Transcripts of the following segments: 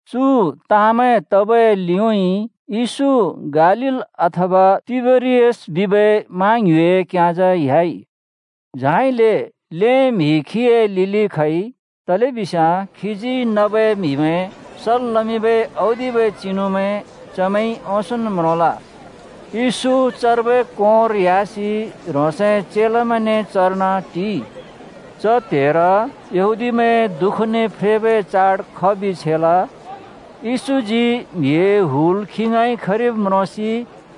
चु ताँमैं तबै लिउँइँ येशू गालील अथवा तिबेरियस बिबै मा ङ्युँइ क्योंजा ह्‍याइ। झाइले ल्हें म्हि खीए लिलि खइ, तलेबिस्याँ खीजी नबै म्हिमैं सल् लमिंबै औदिबै चिनुमैं चमैंइ ओंसोंन् म्रोंल। येशू चर्बै कोंर ह्‍यासि ह्रोंसए चेलामैंने चर्न टिइ। च त्‍हेर यहूदीमैंए दुःखने फ्रेबै चाड खबि छेल। येशूजी म्हिए हुल खी ङाँइ खरिब् म्रोंसि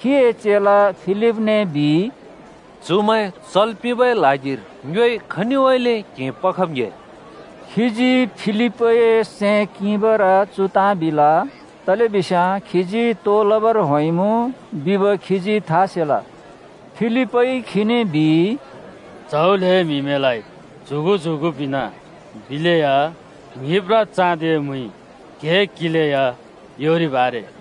खीए चेला फिलिपने बिइ, “चुमैं चल् पिंबै ल्हागिर ङ्योइ खनिउँइँले क्हें पखब् ङ्‍हे?” खीजी फिलिपए सैं किंबर चु ताँ बिल, तलेबिस्याँ खीजी तो लबर होंइँमुँ बिब खीजी था सेल। फिलिपइ खीने बिइ, “च्‍हौ ल्‍हें म्हिमैंलाइ च्‍युगु च्‍युगु पिंना बिलेया ङ्हिब्ब्रा चाँदिए मुइइ क्हें किंलेया योरिब् आरे।”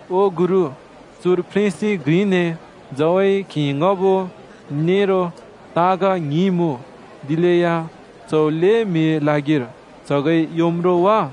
“ओ गुरु, चुर फ्रेंसि घ्रिने झउए क्हें ङ्‍हबो नेरो ताँग ङ्हिं मुँ। दिलेया च्‍हौ ल्‍हें म्हिए ल्हागिर च्हगइ योम् रो वा?”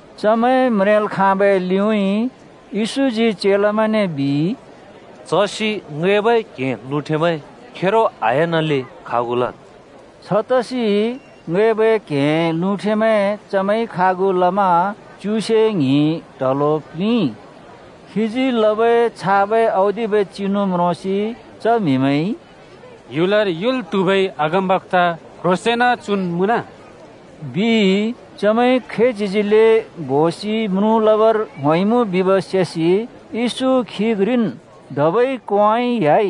चमैं म्रेंल् खाँबै लिउँइँ येशूजी चेलामैंने बिइ, “चसि ङैंबै क्हें लुँठेमैं खेरो आह्‍यानले खागु लद्।” छतसि ङैबै क्हेंए लुँठेमैं चमैंइ खागु लमा च्युसे ङ्हिं ट्हलो प्‍लिंइ। खीजी लबै छाबै औदिबै चिनु म्रोंसि च म्हिमैंइ “ह्‍युलर युल् त्हुबै अगमबक्‍ता क्ह्रोंसेंन चुन् मुँन,” बिइ। चमैंइ खैच्हिजिले बोसि म्रुँ लबर होंइमुँ बिब् सेसि यशू खी घ्रिन् धबै कोंउँइँ ह्‍याइ।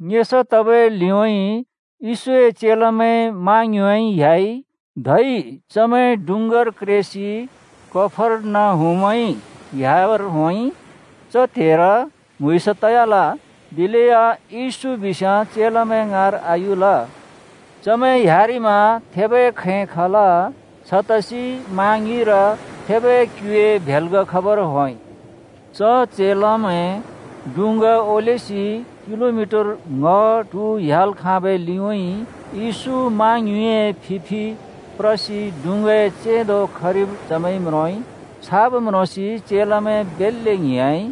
ङेसा तबै लिउँइँ येशूए चेलामैं मा ङ्युँइउँइँ ह्‍‍याइ। धै चमैं डुँङ्गार क्रेसि कफर्नहुमउँइँ ह्‍याबर होंइ। च त्हेर म्हुँइँस तयाल, दिलेया येशू बिस्याँ चेलामैं ङाँर आयुल। चमैं ह्‍यारिमा थेबै खैं खल। छतसि मा ङ्युँइर थेबै क्युए भेल्ग खबर होंइ। च चेलामैं डुँङ्गा ओलेसि किलोमिटर ङ्‍ह ट्हु ह्‍याल् खाँबै लिउँइँ येशू मा ङ्युँइए फि फि प्रसि डुँङ्गाए चेंदो खरिब चमैंइ म्रोंइ। छाब् म्रोंसि चेलामैं बेल्‍ले ङ्हिंयाँइ।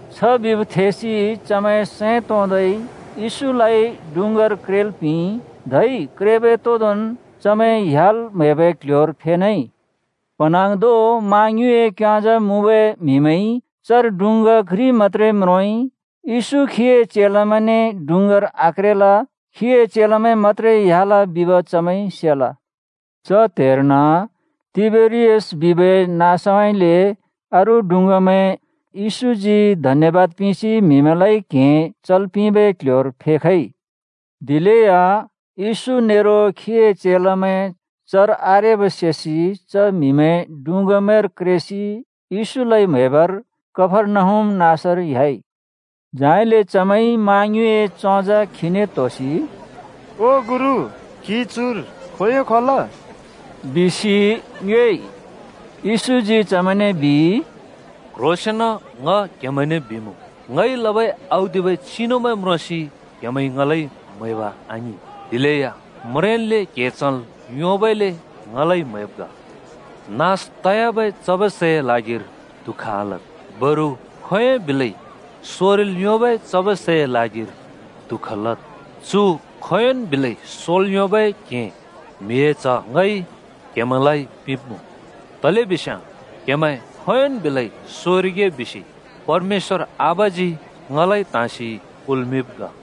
छ बिब् थेसि चमैं सैं तोंदै येशूलाइ डुँङ्गार क्रेल् पिंइ। धै क्रेबै तोंदोंन् चमैं ह्‍याल् म्हैबै क्ल्ह्‍योर फेनेइ। प्हँन्हाँग्धों मा ङ्युँइए क्‍योंजा मुँबै म्हिमैंइ चर डुँङ्गा घ्रि मत्‍त्रे म्रोंइ। येशू खीए चेलामैंने डुँङ्गार आक्रेल, खीए चेलामैं मत्‍त्रे ह्‍याल बिब चमैंइ सेल। च त्हेर्न तिबेरियास बिबै नाँसउँइँले अरू डुँङ्गामैं येशूजी धन्यबाद पिंसि म्हिमैंलाइ क्हें चल् पिंबै क्ह्‍योर फेखइ। दिलेया येशू नेरो खीए चेलामैं चर आरेब सेसि च म्हिमैं डुँङ्गामैंर क्रेसि येशूलाइ म्‍हैबर कफर्नहुम नाँसर ह्‍याइ। झाइले चमैंइ मा ङ्युँइए चोंजा खीने त्होसि, “ओ गुरु, क्‍हि चुर खोंयों खल? बिसि ङ्योएइ।” येशूजी चमैंने बिइ, “क्ह्रोंसेंन ङ क्हेमैंने बिमुँ, ङइ लबै औदिबै चिनुमैं म्रोंसि क्हेमैंइ ङलाइ म्हैब आङिं, दिलेया म्रेंन्ले क्‍हें चल् योंबइले ङलाइ म्‍हैब् ग। नास तयाबै चबै सैए ल्हागिर दुःख आलद्, बरु खोंयोंइ बिलै सोरिल् योंबै चबै सैए ल्हागिर दुःख लद्। चु खोंयोंन् बिलै सोल् योंबै क्हें म्हिए च्ह ङइ क्हेमैंलाइ पिंब्मुँ, तलेबिस्याँ क्हेमैं खोंयोंन् बिलै सोरिगे बिसि परमेश्‍वर आबाजी ङलाइ त्हाँसि कुल्मिंब् ग।”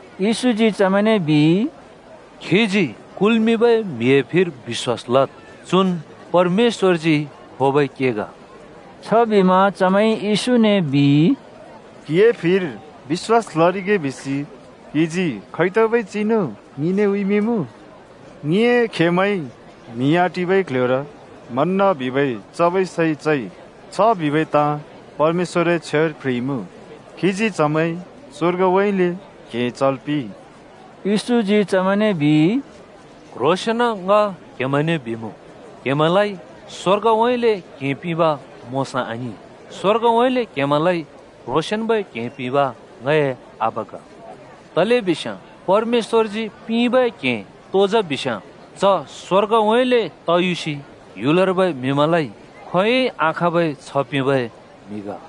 येशूजी चमैंने बिइ, “खीजी कुल्‍मिंबै म्हिए फिर बिश्‍वास लद्, चुन् परमेश्‍वरजी खोबै के ग।” छबिमा चमैंइ येशूने बिइ, “क्हिए फिर बिश्‍वास लरिगे बिसि क्हिजी खैतबै चिनु ङिने उँइँमिंमुँ? ङिए खेमैंइ म्हि आटिबै क्ल्ह्‍योर मन्‍न बिबै चबै सै चइ। छ बिबै ताँ परमेश्‍वरए छ्वेर प्ह्रिइमुँ, ‘खीजी चमैं स्‍वर्गउँइँले क्हें चल् पिंइ।’” येशूजी चमैंने बिइ, “क्‍ह्रोंसेंन ङ क्‍हेमैंने बिमुँ, क्हेमैंलाइ स्वर्गउँइँले क्हें पिंब मोशाइ आङिं, स्वर्गउँइँले क्हेमैंलाइ क्ह्रोंसेंन्बै क्हें पिंब ङए आबा ग। तलेबिस्याँ परमेश्‍वरजी पिंबै क्हें तो जा बिस्‍याँ, च स्‍वर्गउँइँले तयुसि ह्‍युलर्बै म्हिमैंलाइ खोंयोंइ आखाँबै छ्ह पिंबै म्हि ग।”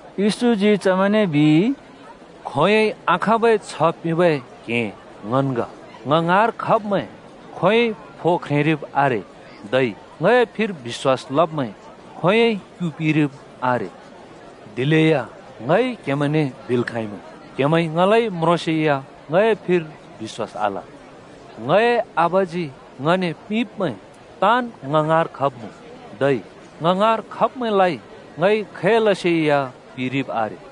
येशूजी चमैंने बिइ, “खोंयोंइ आखाँबै छ्ह पिंबै क्हें ङन् ग। ङ ङाँर खब्‍मैं खोंयोंइ फो ख्रेंरिब आरे, धै ङए फिर बिश्‍वास लब्‍मैं खोंयोंइ क्‍यु पिरिब आरे। दिलेया ङइ क्हेमैंने बिल् खाँइमुँ, क्‍हेमैंइ ङलाइ म्रोंसेया ङए फिर बिश्‍वास आल। ङए आबाजी ङने पिंब्‍मैं ताँन् ङ ङाँर खब्‍मुँ, धै ङ ङाँर खब्‍मैंलाइ ङइ खैलसे या पिरिब् आरे।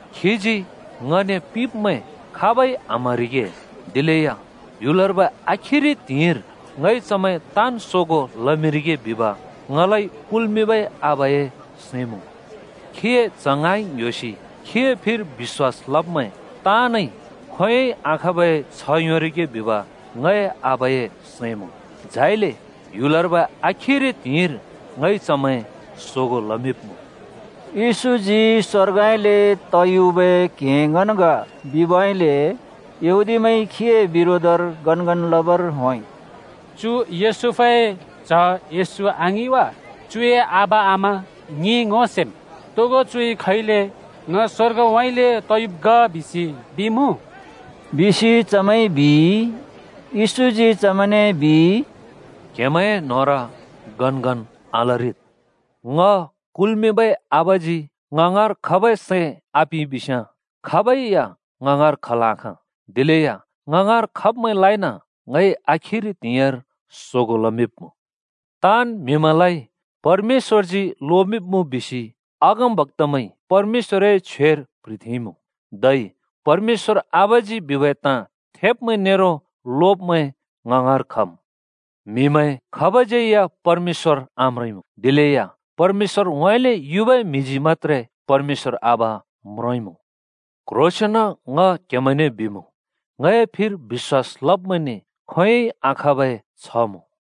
खीजी ङने पिंब्‍मैं खाबै आम्हरिगे, दिलेया ह्‍युलर्बै आखिरि त्हिंइर ङइ चमैं ताँन् सोगों लमिंरिगे बिब ङलाइ कुल्‍मिंबै आबाए सैं मुँ। खीए च्ह ङाँइ ङ्‍ह्‍योसि खीए फिर बिश्‍‍वास लब्‍मैं ताँनइ खोंयोंइ आखाँबै छ्‍ह योंरिगे बिब ङए आबाए सैं मुँ। झाइले ह्‍युलर्बै आखिरि त्हिंइर ङइ चमैं सोगों लमिंब्मुँ।” येशूजी “स्‍वर्गउँइँले तयुबै क्हें ङन् ग” बिबइले यहूदीमैंइ खीए बिरोधर गनगन लबर होंइ। “चु योसेफए च्‍ह येशू आङिं वा? चुए आबा-आमा ङिइ ङो सेम्। तोगो चुइ खैले ङ स्‍वर्गउँइँले तयुब् ग बिसि बिमुँ?” बिसि चमैंइ बिइ। येशूजी चमैंने बिइ, “क्‍हेमैं न्होंर गनगन आलरिद्। ङ कुल्‍मिंबै आबाजी ङ ङाँर खबै सैं आपिंइ बिस्‍याँ खाबै या ङ ङाँर खल् आखाँ। दिलेया ङ ङाँर खब्‍मैंलाइन ङइ आखिरि त्हिंइर सोगों लमिंब्मुँ। ‘ताँन् म्हिमैंलाइ परमेश्‍वरजीन् लोमिंब्मुँ,’ बिसि अगमबक्‍तामैंइ परमेश्‍वरए छ्वेर प्‍ह्रिथेंइँमुँ। धै परमेश्‍वर आबाजी बिबै ताँ थेब्मैं नेरो लोब्मैं ङ ङाँर खम्। म्हिमैं खाबज्यै या परमेश्‍वर आम्रोंइँमुँ, दिलेया परमेश्‍वरउँइँले युबै म्हिजी मत्‍त्रे परमेश्‍वर आबा म्रोंइँमुँ। क्ह्रोंसेंन ङ क्हेमैंने बिमुँ, ङए फिर बिश्‍वास लब्मैंने खोंयोंइ आखाँबै छ्‍ह मुँ।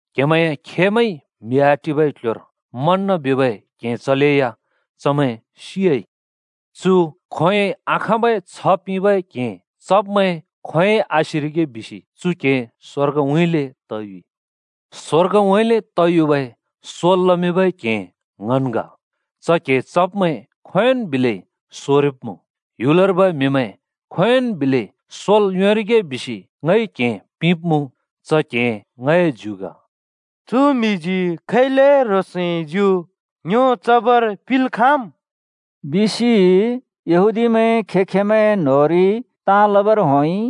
क्‍हेमैंए खेमैंइ म्हि आटिबै क्ल्ह्‍योर मन्‍न बिबै क्हें चलेया चमैं सियाइ। चु खोंयोंइ आखाँबै छ्ह पिंबै क्हें चब्मैं खोंयोंइ आसिरिगे बिसि चु क्हें स्‍वर्गउँइँले तयुइ। स्‍वर्गउँइँले तयुबै सोल् लमिंबै क्हें ङन् ग। च क्हें चब्मैं खोंयोंन् बिलै सोरिब्मुँ। ह्‍युलर्बै म्हिमैं खोंयोंन् बिलै सोल् योंरिगे बिसि ङइ क्हें पिंब्मुँ। च क्हें ङए ज्यु ग।” “चु म्हिजी खैले ह्रोंसए ज्यु ङ्यो चबर पिंल् खाँम्?” बिसि यहूदीमैं खें-खेंमैंए न्होंरि ताँ लबर होंइ।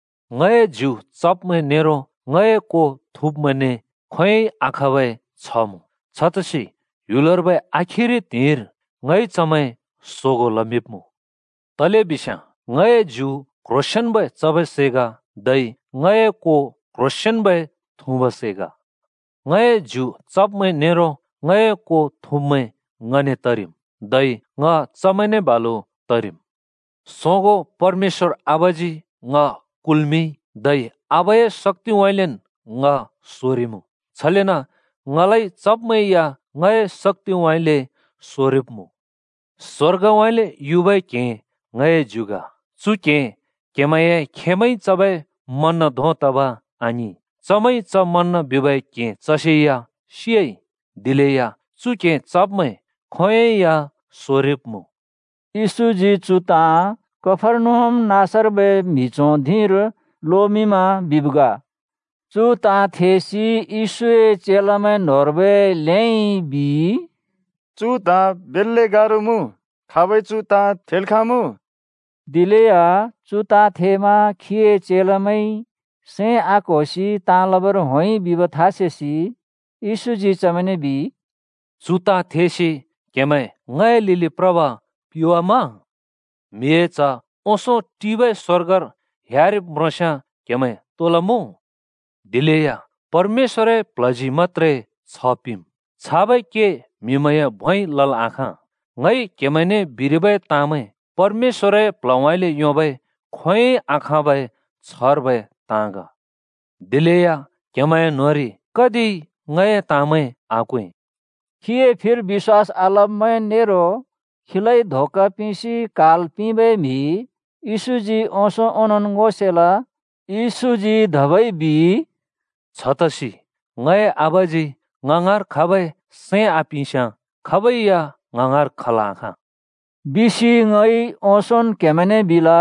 ङए ज्यु चब्‍मैं नेरो ङए को थुँब्‍मैंने खोंयोंइ आखाँबै छ्ह मुँ, छतसि ह्‍युलर्बै आखिरि त्हिंइर ङइ चमैं सोगों लमिंब्मुँ। तलेबिस्याँ ङए ज्यु क्‍ह्रोंसेंन्‍बै चबै सै ग, धै ङए को क्‍ह्रोंसेंन्‍बै थुँबै सै ग। ङए ज्यु चब्मैं नेरो ङए को थुँब्मैं ङने तरिम्, धै ङ चमैंने बालु तरिम्। सोगों परमेश्‍वर आबाजी ङ कुल्मिंइ, धै आबाए शक्‍तिउँइँलेन् ङ सोरिमुँ। छलेन ङलाइ चब्मैं या ङए शक्‍तिउँइँले सोरिब्मुँ। स्वर्गउँइँले युबै क्हें ङए ज्यु ग। चु क्हें क्हेमैंए खेमैंइ चबै मन्‍न धों तब आङिं, चमैंइ च मन्‍न बिबै क्हें चलेया सियाइ। दिलेया चु क्हें चब्मैं खोंयोंइ या सोरिब्मुँ।” येशूजी चु ताँ कफर्नहुम नाँसर्बै म्हि च्हों धिंर लोमिंमा बिब् ग। चु ताँ थेसि येशूए चेलामैं न्होंर्बै ल्हेइ बिइ, “चु ताँ बेल्‍ले गारो मुँ। खाबइ चु ताँ थेल् खाँमुँ?” दिलेया चु ताँ थेमा खीए चेलामैंइ सैं आक्होसि ताँ लबर होंइ बिब था सेसि येशूजी चमैंने बिइ, “चु ताँ थेसि क्हेमैं ङए लिलि प्रब पिवाम्मा? म्हिए च्ह ओंसों टिबै स्वर्गर एह्‍यारिब् म्रोंस्याँ क्हेमैं तो लमुँ? दिलेया परमेश्‍वरए प्ल्हजी मत्‍त्रे छ्ह पिंमुँ, छाबै के म्हिमैंए भोंइ लल् आखाँ। ङइ क्हेमैंने बिरिबै ताँमैं परमेश्‍वरए प्ल्हउँइँले योंबै खोंयोंइ आखाँबै छ्हर्बै ताँ ग। दिलेया क्‍हेमैंए न्‍होंरि कतिइ ङए ताँमैं आक्वें।” (खीए फिर बिश्‍वास आलब्मैं नेरो खीलाइ धोका पिंसि क्हाल् पिंबै म्हि येशूजी ओंसों ओंनोंन् ङो सेल।) येशूजी धबै बिइ, “छतसि ङए आबाजी ङ ङाँर खबै सैं आपिंस्याँ खाबै या ङ ङाँर खल् आखाँ,” बिसि ङइ ओंसोंन् क्‍हेमैंने बिल।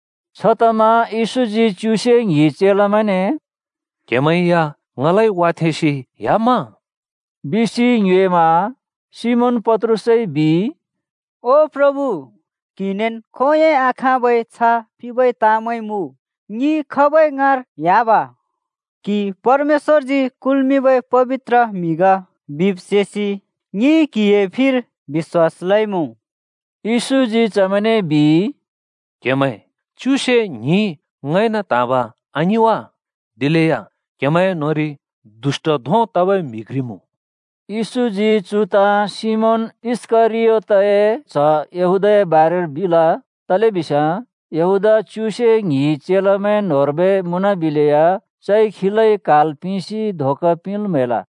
छतमा येशूजी च्युसे ङ्हिं चेलामैंने “क्हेमैं या ङलाइ वाथेंसि ह्‍याम्‍म?” बिसि ङ्योएमा। सिमोन पत्रुसइ बिइ, “ओ प्रभु, क्हिनेन् खोंयोंइ आखाँबै छ्ह पिंबै ताँमैं मुँ। ङि खाबै ङाँर ह्‍याब? क्हि परमेश्‍वरजी कुल्मिंबै पबित्र म्हि ग बिब् सेसि ङिइ क्हिए फिर बिश्‍वास लइमुँ।” येशूजी चमैंने बिइ, “क्‍हेमैं च्युसे ङ्हिं ङइन त्‍हाँब, आङिं वा? दिलेया क्‍हेमैंए न्‍होंरि दुष्‍ट धों तबै म्हि घ्रि मुँ।” येशूजी चु ताँ सिमोन इस्‍करियोतए च्‍ह यहूदाए बारेर बिल, तलेबिस्याँ यहूदा च्युसे ङ्हिं चेलामैं न्‍होंर्बै मुँनबिलेया चइ खीलाइ क्हाल् पिंसि धोका पिंल् म्हैल।